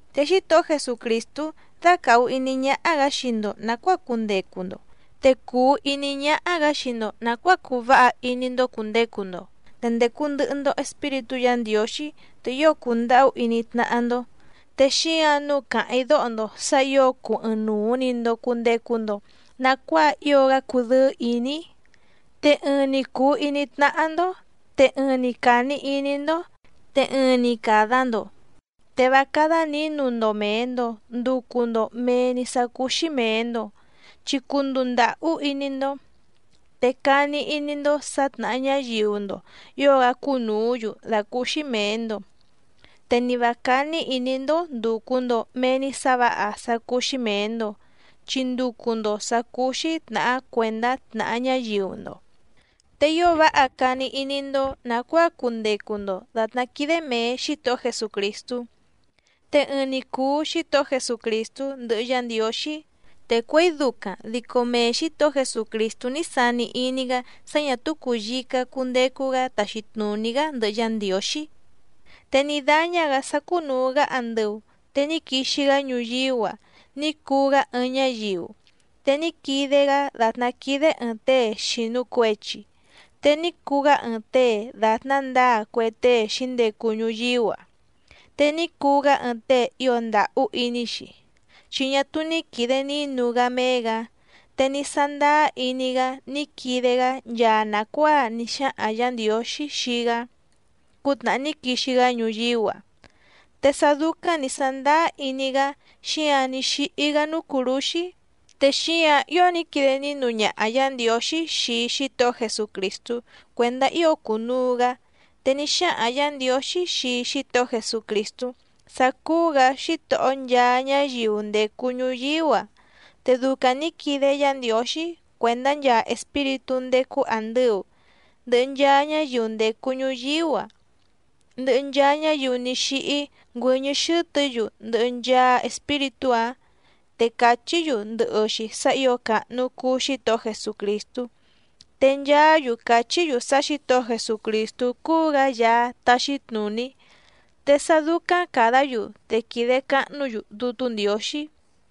Te Xítohó Jesucrìstú dácàhu iní ñáhá‑gǎ xii‑ndo nàcuáa cundecu‑ndo, te cùu iní ñáhá‑gǎ xii‑ndo nàcuáa cuu váha iní‑ndó cùndecu‑ndo, te ndècu ndɨhɨ‑ndo Espíritú Yǎ Ndiǒxí, te ío cùndahú iní tnáhá‑ndó. Te xíǎⁿ nǔu càháⁿ‑í dóho‑ndo sǎ ǐo cuu ɨɨⁿnuu‑ni‑ndo cùndecu‑ndo nacuáa ío‑gá cudɨ́ɨ́ ìní‑í, te ɨɨⁿ‑ni cùu iní tnáhá‑ndó, te ɨɨⁿ‑ni càni iní‑ndó, te ɨɨⁿ‑ni càda‑ndo. Te vá cádá nǐnu‑ndo mèe‑ndo nducu‑ndo mee‑ni sá cúú‑xí mèe‑ndo, chi cunduu ndàhú iní‑ndó, te cani iní‑ndó sǎ tnàha ñáyiu‑ndo ǐo‑gá cúnùú‑yu dàcúúxí mèe‑ndo. Te ni vǎ cání ìní‑ndó ndùcu‑ndo mee‑ni sá vǎha sá cúú‑xí mèe‑ndo, chi nducu‑ndo sǎ cúú‑xí tnàhá cuèndá tnàha ñáyiu‑ndo. Te ío váha cani iní‑ndó nàcuáa cundecu‑ndo dàtná quídé mèe Xítohó Jesucrìstú. Te ɨɨⁿ‑ni cùu Xítohó Jesucrìstú ndɨhɨ Yá Ndiǒxí. Te cuěi ducaⁿ dico mee Xǐtohó Jesucrìstú ní sani iní‑gá sá ñà túú cùyica cundecu‑gá taxi tnùní‑gá ndɨhɨ Yá Ndiǒxí. Te ní dáñá‑gǎ sá cúnùu‑gá andɨu te ní quixi‑gá ñuyíú‑a ní cuu‑gá ɨɨⁿ ñáyiu, te ní quide‑gá dàtná quídé ɨ̀ɨⁿ tée xìnu cuechi. Te ní cuu‑gá ɨɨⁿ tée dàtná ndǎa cue tée xǐndecu ñuyíú‑a, te ní cuu‑gá ɨɨⁿ tée ío ndàhú iní‑xi chi ñá túú ní quìde nínu‑gá méé‑gǎ, te ní sándáá iní‑gá ní quide‑gá nchaa nàcuáa ní xáhaⁿ Yǎ Ndiǒxí xii‑gá cútnàhá ní quixi‑gá ñuyíú‑a. Te sá dúcáⁿ nǐ sàndáá iní‑gá xíǎⁿ ní xíhí‑gá núú cùrúxí. Te xíǎⁿ ío ní quide nínu ñaha Yǎ Ndiǒxí xii Xítohó Jesucrìstú cuèndá ío cunuu‑gǎ. Te ní xáhaⁿ Yǎ Ndiǒxí xii Xítohó Jesucrìstú sá cúú‑gǎ Xítohó nchaa ñáyiu ndècu ñuyíú‑a. Te ducaⁿ nǐ quide Yá Ndiǒxí cuèndá nchaa Espíritú ndécú àndɨu, ndɨhɨ nchaa ñáyiu ndècu ñuyíú‑a, ndɨhɨ nchaa ñáyiu ní xíhí ngüɨ́ñɨ́ xɨ́tɨ̌‑yu ndɨhɨ nchaa espíritú‑áⁿ te cachí‑yu ndɨhɨ‑xi sá ǐo càhnu cuu Xítohó Jesucrìstú. Te nchaá‑yu cachí‑yu sá Xǐtohó Jesucrìstú cúú‑gǎ Yaá táxí tnùní. Te sá dúcáⁿ càdá‑yu, te quìde cahnú‑yu Dútú Ndiǒxí.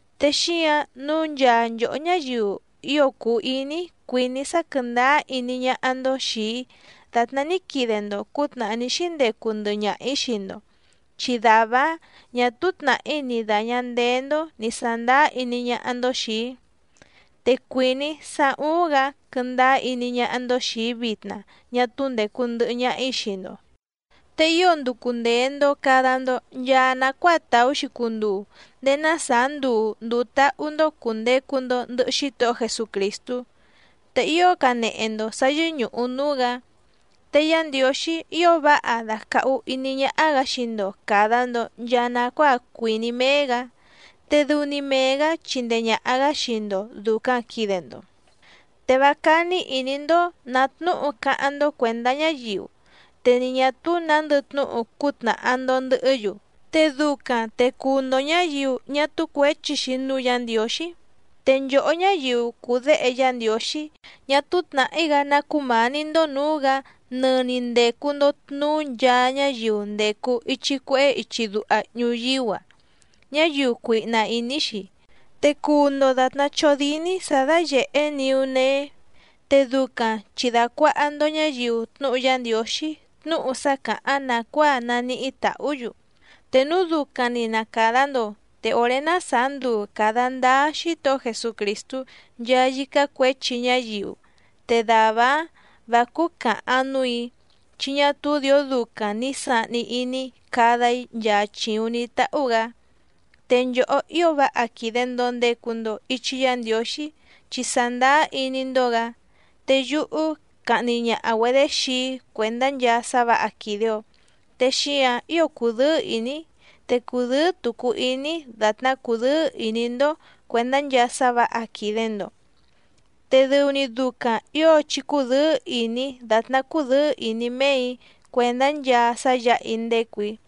Te xíǎⁿ nǔu nchaa nchòhó ñáyiu ío cùu iní‑í cuìní‑í sá quɨ̀ndáá iní ñáhá‑ndó xìi‑í dàtná ní quide‑ndo cǔtnàhá ní xíndecu ndɨhɨ ñaha‑ǐ xii‑ndo, chi dàvá‑áⁿ ñà túú tnàhí ni dàña ndeé‑ndó nì sándáá iní ñáhá‑ndó xìi‑í. Te cuìní‑í sá úúⁿ‑gǎ quɨ́ndáá iní ñáhá‑ndó xìi‑í vitna ñá túú ndècu ndɨhɨ ñaha‑í xii‑ndo. Te ío nducu ndèe‑ndo cada‑ndo nchaa nacuáa tàú‑xi cunduu ndéé ná sàá nduu ndùu táhú‑ndó cùndecu‑ndo ndɨhɨ Xítohó Jesucrìstú, te ío canehe‑ndo sǎ yɨ́ñùhu núú‑gǎ. Te Yá Ndiǒxí ío váha dàcahu iní ñáhá‑gǎ xii‑ndo càda‑ndo nchaa nacuáa cuìní méé‑gǎ, te dɨu‑ni mee‑gǎ chíndèe ñaha‑gá xii‑ndo dùcaⁿ quide‑ndo. Te vá cání ìní‑ndó nǎ tnúhu cáháⁿ‑ndó cuèndá ñáyiu, te ni ñà túú nǎndɨ tnúhu cútnàha‑ndo ndɨhɨ́‑yu, te ducaⁿ te cuu‑ndo ñǎyiu ñá túú cuěchi‑xi núú Yǎ Ndiǒxí. Te nchòhó ñáyiu cùu déhe Yá Ndiǒxí, ñá túú tnàhí‑gá ná cumání‑ndó nǔú‑gǎ nɨni ndècu‑ndo tnuú nchaa ñáyiu ndècu ichi cuehé ichi duha ñuyíú‑a, ñáyiu cuihna ìní‑xi. Te cuu‑ndo dàtná chódíní sǎ dáyèhé niú nee, te ducaⁿ chi dàcuaha‑ndo ñáyiu tnúhu Yá Ndiǒxí tnúhu sá càháⁿ nàcuáa naníhí tàhú‑yu. Te núu ducaⁿ‑ni na càda‑ndo te òré ná sàá nduu càda ndáá Xítohó Jesucrìstú nchaa yícá cuěchi ñáyiu, te dàvá‑áⁿ vǎ cúú càhaⁿ núù‑í, chi ñá túú dìó ducaⁿ ni sàhni iní‑í cada‑í nchaa chìuⁿ ní táhú‑gǎ. Te nchòhó ío váha quìde‑ndo ndecu‑ndo ichi Yá Ndiǒxí chi sàndáá iní‑ndó‑gǎ, te yúhú cahni ñaha‑güedě xii‑í cuèndá nchaa sá vǎha quìde‑ó. Te xíǎⁿ ío cùdɨ́ɨ́ ìní‑í te cùdɨ́ɨ́ tucu iní‑í dàtná cúdɨ̌ɨ́ ìní‑ndó cuèndá nchaa sá vǎha quìde‑ndo. Te dɨu‑ni ducaⁿ ǐo chí cúdɨ̌ɨ́ ìní dàtná cúdɨ̌ɨ́ ìní méè‑í cuèndá nchaa sá yǎha‑í ndécù‑í.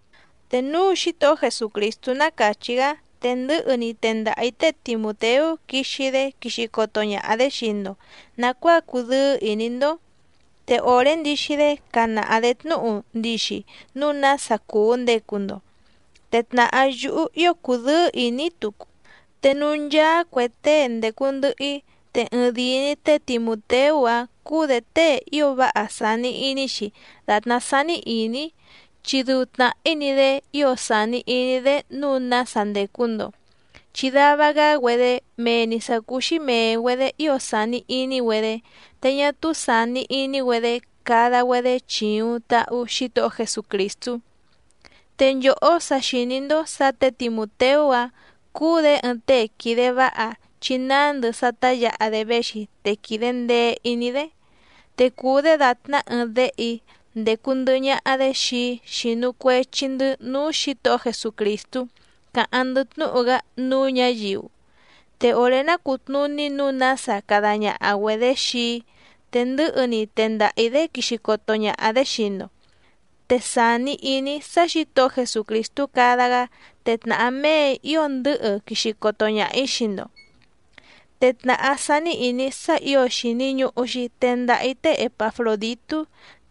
Te núu Xítohó Jesucrìstú ná càchí‑gá te ndɨ̌hɨ‑ni tendaha‑ǐ té Timùteú quixi‑dé quixi coto ñaha‑dě xii‑ndo nàcuáa cudɨ́ɨ́ ìní‑ndó. Te òré ndixi‑dé canaha‑dě tnúhu ndixi núu nása cùu ndecu‑ndo, te tnàhá yúhú ío cudɨ́ɨ́ ìní‑í tucu. Te núú ncháá cuè tée ndècu ndɨhɨ‑í te ɨɨⁿdìi‑ni té Timùteú‑a cùu‑dé tée ío váha sàni iní‑xi dàtná sání ìní‑í, chi dɨu tnàhí‑ni‑dé ío sàni iní‑dé nǔu nása ndècu‑ndo. Chi dava‑gá‑güedé mee‑ni sǎ cúú‑xí mèe‑güedé ío sàni iní‑güedé, te ñá túú sàni iní‑güedé cada‑güedé chìuⁿ tahu Xítohó Jesucrìstú. Te nchòhó sa xìní‑ndó sǎ tě Timùteú‑a cùu‑dé ɨɨⁿ tée quìde váha chi nándɨ sá tá yǎha‑dé véxi te quìde ndee iní‑dé. Te cùu‑dé dàtná ɨɨⁿ déhe‑í ndécú ndɨ̀hɨ ñaha‑dé xii‑í xínú cuèchi‑ndɨ́ núú Xǐtohó Jesucrìstú càháⁿ‑ndɨ́ tnúhu‑gá núú ñǎyiu. Te òré ná cùtnuní nǔu nása cada ñaha‑güedě xii‑í te ndɨ̌hɨ‑ni tendaha‑ǐ‑dé quixi coto ñaha‑dě xii‑ndo. Te sàni iní‑í sá Xǐtohó Jesucrìstú cada‑gá te tnàhá méè‑í ío ndɨ̌hɨ quixi coto ñaha‑ǐ xii‑ndo. Te tnàhá sání ìní‑í sá ǐo xìni ñuhu‑xi tendaha‑í té Epafròditú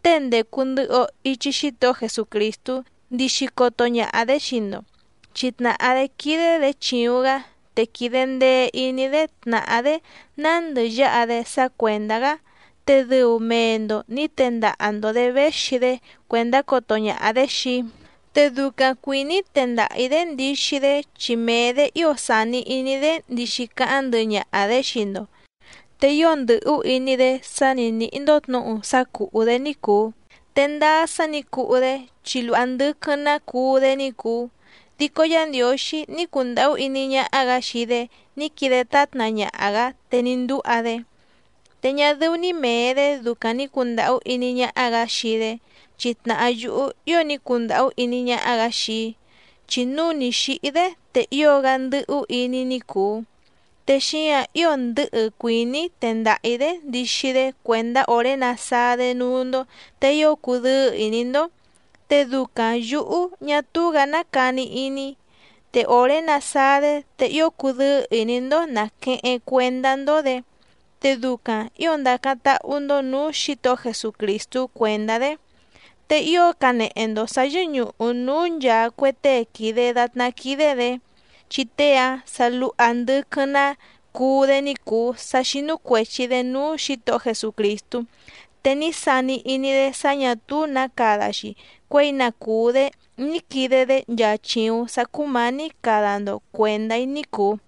tée ndècu ndɨhɨ‑o ichi Xítohó Jesucrìstú ndixi coto ñaha‑dě xii‑ndo, chi tnàhá‑dé quídé‑dě chìuⁿ‑gá te quìde ndee iní‑dé tnàhá‑dé nándɨ yáha‑dé sá cuèndá‑gá, te dɨu mee‑ndo nǐ tendaha‑ndo‑dě véxi‑dé cuèndá coto ñaha‑dě xii‑í. Te ducaⁿ cuìní‑í tendaha‑ǐ‑dé ndixi‑dé chi mee‑dě ío sàni iní‑dé ndixi cáháⁿ ndɨhɨ ñaha‑dě xii‑ndo, te ío ndɨ̀hú iní‑dé sá ni nǐhí‑ndó tnǔhu sá cùhú‑dé ní cùu. Te ndáá sá nǐ cuhú‑dé chi luha ndɨquɨⁿ‑ná cuú‑dé ní cùu, dico Yá Ndiǒxí ní cundàhú iní ñáhá‑gǎ xii‑dé ní quide tátna ñaha‑gǎ te ní ndúha‑dé. Te ñá dɨ́ú‑ní mèe‑dé ducaⁿ nì cundahú iní ñáhá‑gǎ xii‑dé chi tnàhá yúhú ío ní cundàhú iní ñáhá‑gǎ xii‑í, chi núu ni xǐhí‑dé te ío‑gá ndɨ́hú iní‑í ní cùu. Te xíǎⁿ ío ndɨ̌hɨ cuìní‑í tendaha‑ǐ‑dé ndixi‑dé cuèndá òré nasáá‑dé núú‑ndó te ío cudɨ́ɨ́ ìní‑ndó, te ducaⁿ yǔhú ñá túú‑gǎ ná cani iní‑í. Te òré nasáá‑dé te ío cudɨ́ɨ́ ìní‑ndó nàqueheⁿ cuendá‑ndó‑dě, te ducaⁿ ǐo ndacáⁿ táhú‑ndó nǔú Xǐtohó Jesucrìstú cuèndá‑dé. Te ío canehe‑ndo sǎ yɨ́ñùhu núú nchàa cue tée quìde datná quídé‑dě. Chi tée‑a sa luha ndɨquɨⁿ‑ná cuú‑dé ní cùu sá xínú cuèchi‑dé núú Xǐtohó Jesucrìstú, te ní sani iní‑dé sá ñà túú nǎ cada‑xi cuěi na cùú‑dé ní quide‑dé nchaa chìuⁿ sá cúmǎní cada‑ndo cuèndá‑í ní cùu.